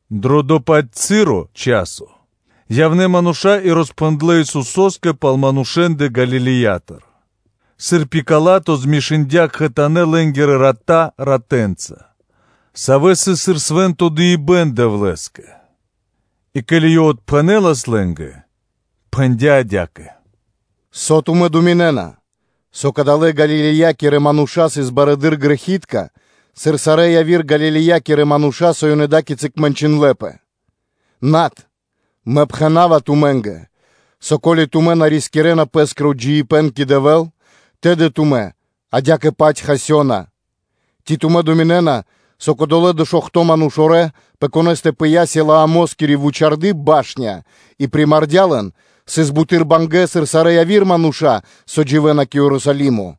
Дро дова́-паць часо явнэ́ мануша́ и роспхэндлэ́ Исусо́скэ пал манушэ́ндэ Галилеятыр, сыр Пила́то змешындя кхэтанэ́ лэ́нгирэ рата ратэнца, савэ́ сыс сыр свэ́нто дыибэ́н Дэвлэ́скэ. И ке́ли Ёв отпхэнэ́лас лэ́нгэ пэ дава́, то пхэндя́ адя́кэ: “Со тумэ́ думинэ́на, со кадалэ́ Галилеякирэ мануша́ сыс барэды́р грэхи́тка, сыр сарэ́ яви́р Галилеякирэ мануша́, со ёнэ ада́кицы мэнчындлэпэ? Над, Мэ пхэна́ва тумэ́нгэ, со, ко́ли тумэ́ на рискирэна пэ́скиро джиибэ́н кэ Дэвэ́л, тэды тумэ́ адя́кэ-паць хасёна. Ци тумэ́ думинэ́на, со кодолэ́ дэшуохто (бидуе́нгиро биш) манушорэ, пэ конэ́стэ пыя́ Силаамоскири вучарды́ (башня) и примардя лэн, сыс буты́р бангэ́, сыр сарэ́ яви́р мануша́, савэ́ дживэ́на кэ Ерусалимо?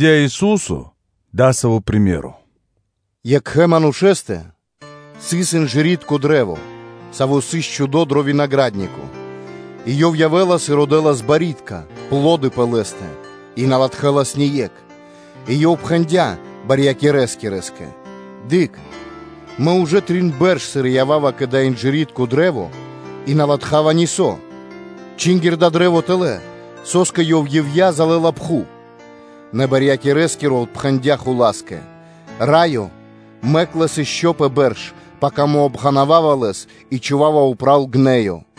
И пхэндя́ Ису́со дасаво приме́ро (сыкаибэ́н): “Вари-савэ́ манушэ́стэ сыс инжыритко кашт (дрэ́во), саво́ сыс чхудо дро винагра́днико, и ёв явдя́ тэ родэ́л барьякирдэ́ (пло́ды) пэ лэ́стэ и на латхэлас ни екх. И ёв пхэндя́ садовникоскэ (барьякирэскэ): ‘Дыкх, Мэ ужэ три́то бэрш, сыр мэ ява́ва тэ родав барьякирдэ́ пэ дава́ инжыритко кашт и на латхава нисо́: чингир дава́ кашт тэлэ́; со́скэ ёв ивья́ (дармэс) залэла пхув?’ Нэ барьякирэскиро отпхэндя́ хула́скэ: ‘Раё, мэк лэс ишчо (инкэ́) пэ бэрш, пака Мэ обґанавава лэс и чхува́ва упрэ́ гнэё (мэста),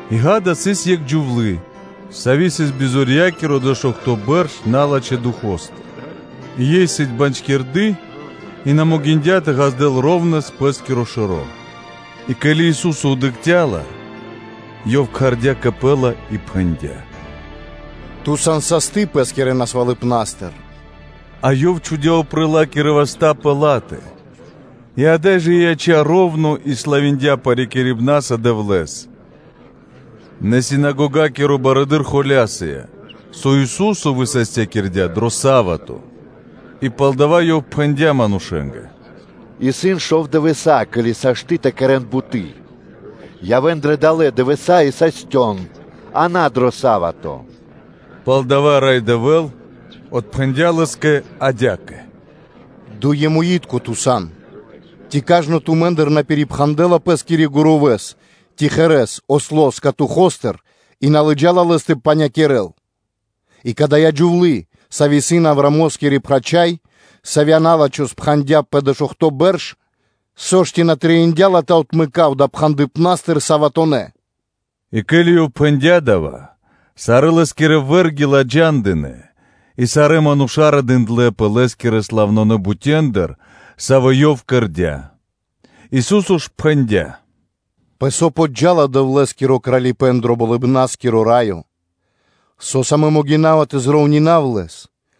Одо́й сыс екх джувлы́, сави́ сыс бизорьякири дэшуохто бэрш налачхэ́ духо́стыр (фаностыр); ёй сыс бандькирды и на могиндя́ тэ розбандёл. И ке́ли Ису́со дыкхця́ ла, Ёв кхардя́ ла кэ Пэ и пхэндя́: “Джувлие, яв састы тырэ́ бизорьякирибнастыр.” И Ёв чхудя́ упрэ́ Лэ́скирэ васта́ пэ ла́тэ; и ада́й жэ ёй яця́ роўно и славиндя парикирибнаса Дэвлэ́с. Нэ синагогакиро барыдыро́ холя́сыя, со Ису́со высастякирдя́ дро са́вато, и палдава́ ёв пхэндя́ манушэ́нгэ: “Исын шов дывэса́, ке́ли сашты́ (можна) тэ кэрэ́н буты́; явэ́н дрэ далэ́ дывэса́ и састён, а на дро са́вато.” Пал дава́ Рай Дэвэ́л отпхэндя́ лэ́скэ адя́кэ: “Дуемуитко, ту сан! Ци кажно тумэ́ндыр на пирипхандэла пэ́скирэ гурувэ́с ци осло́с катухостыр и на лыджалэс лэс тэ панякирэл? И кадая́ джувлы́, сави́ исын Авраамоскири прачхай, савья́ на́лачхо спхандя пэ дэшуохто бэрш, со ж, ци на трэиндя́ ла тэ отмэкав далэ́ пхандыпнастыр саватонэ́ (суботонэ́)?” И ке́ли Ёв пхэндя́ дава́, сарэ́ Лэ́скирэ вэ́рги ладжандынэ; и сарэ́ мануша́ радындлэпэ Лэ́скирэ славнонэ бутендыр, савэ́ Ёв кэрдя́. Ису́со ж пхэндя́: “Пэ со зджа́ла (поджала) Дэвлэ́скиро Кралипэ́н дро Болыбна́скиро Раё. Со́са Мэ могина́ва тэ припарував (тэ прироўнинав) лэс?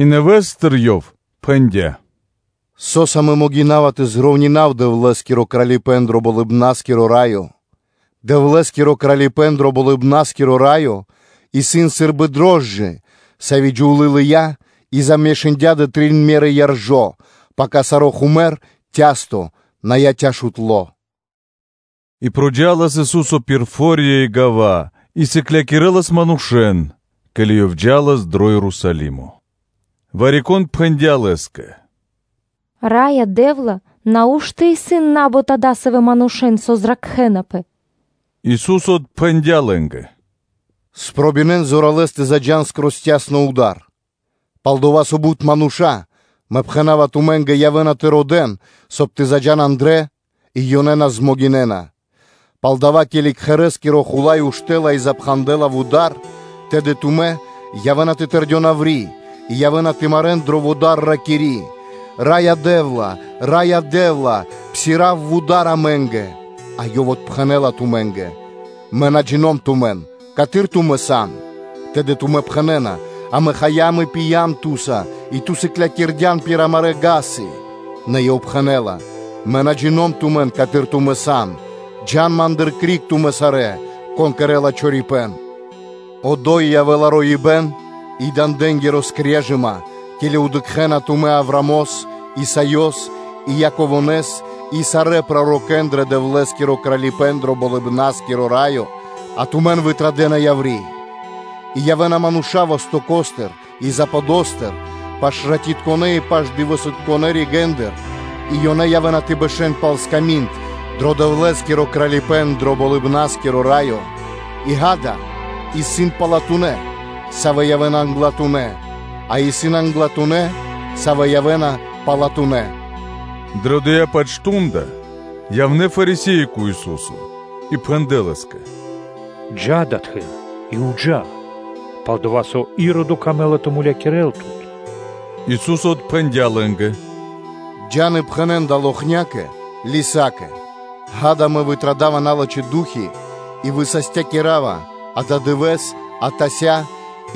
И нэвэ́стыр Ёв пхэндя́: “Со́са Мэ могина́ва тэ припарував (тэ прироўнинав) Дэвлэ́скиро Кралипэ́н дро Болыбна́скиро Раё? Дэвлэ́скиро Кралипэ́н дро Болыбна́скиро Раё исын сы́рбы дрожджы (рошчына), савэ́ джувлы́ лыя́ и замешындя дрэ трин меры яржо́, пака саро́ хумэр (цясто) на яця́ шутло.” И джа́лас Ису́со пир фо́рья и гава́ и сыклякирэлас манушэ́н, ке́ли Ёв джа́лас дро Ерусалимо. Вари-кон пхэндя́ Лэ́скэ: “Раё Дэ́вла!” Нау́што исын на́бут адасавэ́ мануша́, савэ́ зракхэнапэ?” Ису́со отпхэндя́ лэ́нгэ: “Спробинэн зоралэ́с тэ заджа́н пир цясно вуда́р, пал-дова́ со бут мануша́, Мэ пхэна́ва тумэ́нгэ, явэ́на тэ родэ́н, соб (кай) тэ заджа́н андрэ́, и ёнэ на дэ́на ра́да (змогинэна). Пало́ дава́, ке́ли кхэрэ́скиро хула́й уштэ́ла и запхандэла вуда́р, тэды тумэ́ явэ́на тэ тэрдён яври́ и явэ́на тэ марэ́н дро вуда́р, ракири́: ‘Раё Дэ́вла! Раё Дэ́вла.” Псирав (отпхандэ) вуда́р амэ́нгэ,” а Ёв отпхэнэ́ла тумэ́нгэ: “Мэ на джино́м (на джина́в) тумэн, каты́р тумэ́ сан?’ тэды тумэ́ пхэнэ́на: ‘Амэ хаям и пиям Ту́са, и Ту сыклякирдян пир амарэ́ вули́цы (га́сы);’ нэ Ёв пхэнэ́ла: ‘Мэ на джино́м тумэн, каты́р тумэ́ сан; джа́н Ма́ндыр криг тумэ́ сарэ́, кон кэрэ́ла чорипэ́н.’ Одо́й явэ́ла роибэ́н и дандэнгири скрежыма, ке́ли дыкхэ́на тумэ́ Авраамос, Исаёс и Яково́с и сарэ́ пророкэ́н дро Дэвлэ́скиро Кралипэ́н дро Болыбна́скиро Раё, а тумэн кокорэн вытрадэна яври́. И явэ́на мануша́ вастоко́стыр и западостыр, паш-ратитконэ́ и паш-дывэсытконэ́ ригэ́ндыр, и ёнэ явэ́на тэ бэшэ́н пал сками́нд дро Дэвлэ́скиро Кралипэ́н дро Болыбна́скиро Раё. И, ґа́да, исын палатунэ́, савэ́ явэ́на англатунэ́; а исын англатунэ́, савэ́ явэ́на палатунэ́.” Дрэ дова́ дывэ́с явнэ́ Фарисе́и кэ Ису́со и пхэндлэ́ Лэ́скэ: “Джа́ адатхы́р и джа́ (пэ́скэ), пал-дова́ со Иродо камэ́ла тэ мулякирэ́л Тут.” Ису́со отпхэндя́ лэ́нгэ: “Джа́н и пхэнэ́н далэ́ локхнякэ (лисакэ); ґа́да, Мэ традава криг налачхэ́ ду́хи (фаны) и высастякирава ададывэ́с, атася́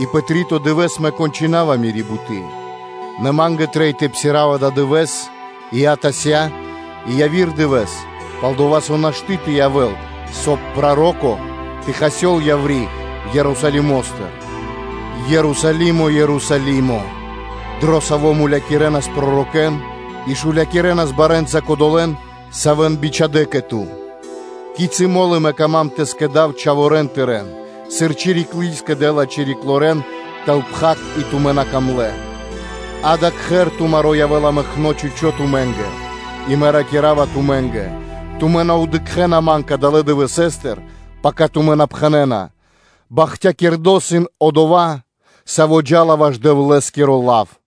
и пэ три́то дывэ́с Мэ кончынава мири́ буты́; нэ Ма́нгэ трэй тэ псирав ададывэ́с и атася́ и яви́р дывэ́с, пал-дова́ со нашты́ тэ явэ́л, соб (кай) проро́ко тэ хасёл яври́ Ерусалимо́стыр. Ерусалимо! Ерусалимо! Дро саво́ мулякирэнас пророкэ́н и шулякирэнас барэ́нца кодолэ́н, савэ́н бичхадя́ кэ ту. Кицы́ мо́лы Ма́нгэ исын пэ ило́ тэ скэдав чхаворэ́н тырэ́н, сыр чириклы скэдэ́ла чириклорэн тэл пхак и тумэ́ на камлэ́! Ѓа́да, кхэр тумаро́ явэ́ла мэкно́ чхучо́ тумэ́нгэ; и Мэ ракира́ва тумэ́нгэ: тумэ́ на явэ́на тэ дыкхэ́н Ман кадалэ́ дывэсэ́стыр, пака тумэ́ на пхэнэ́на: “Бахтякирдо́ исын Одова́, Саво́ джа́ла ваш Дэвлэ́скиро лав.”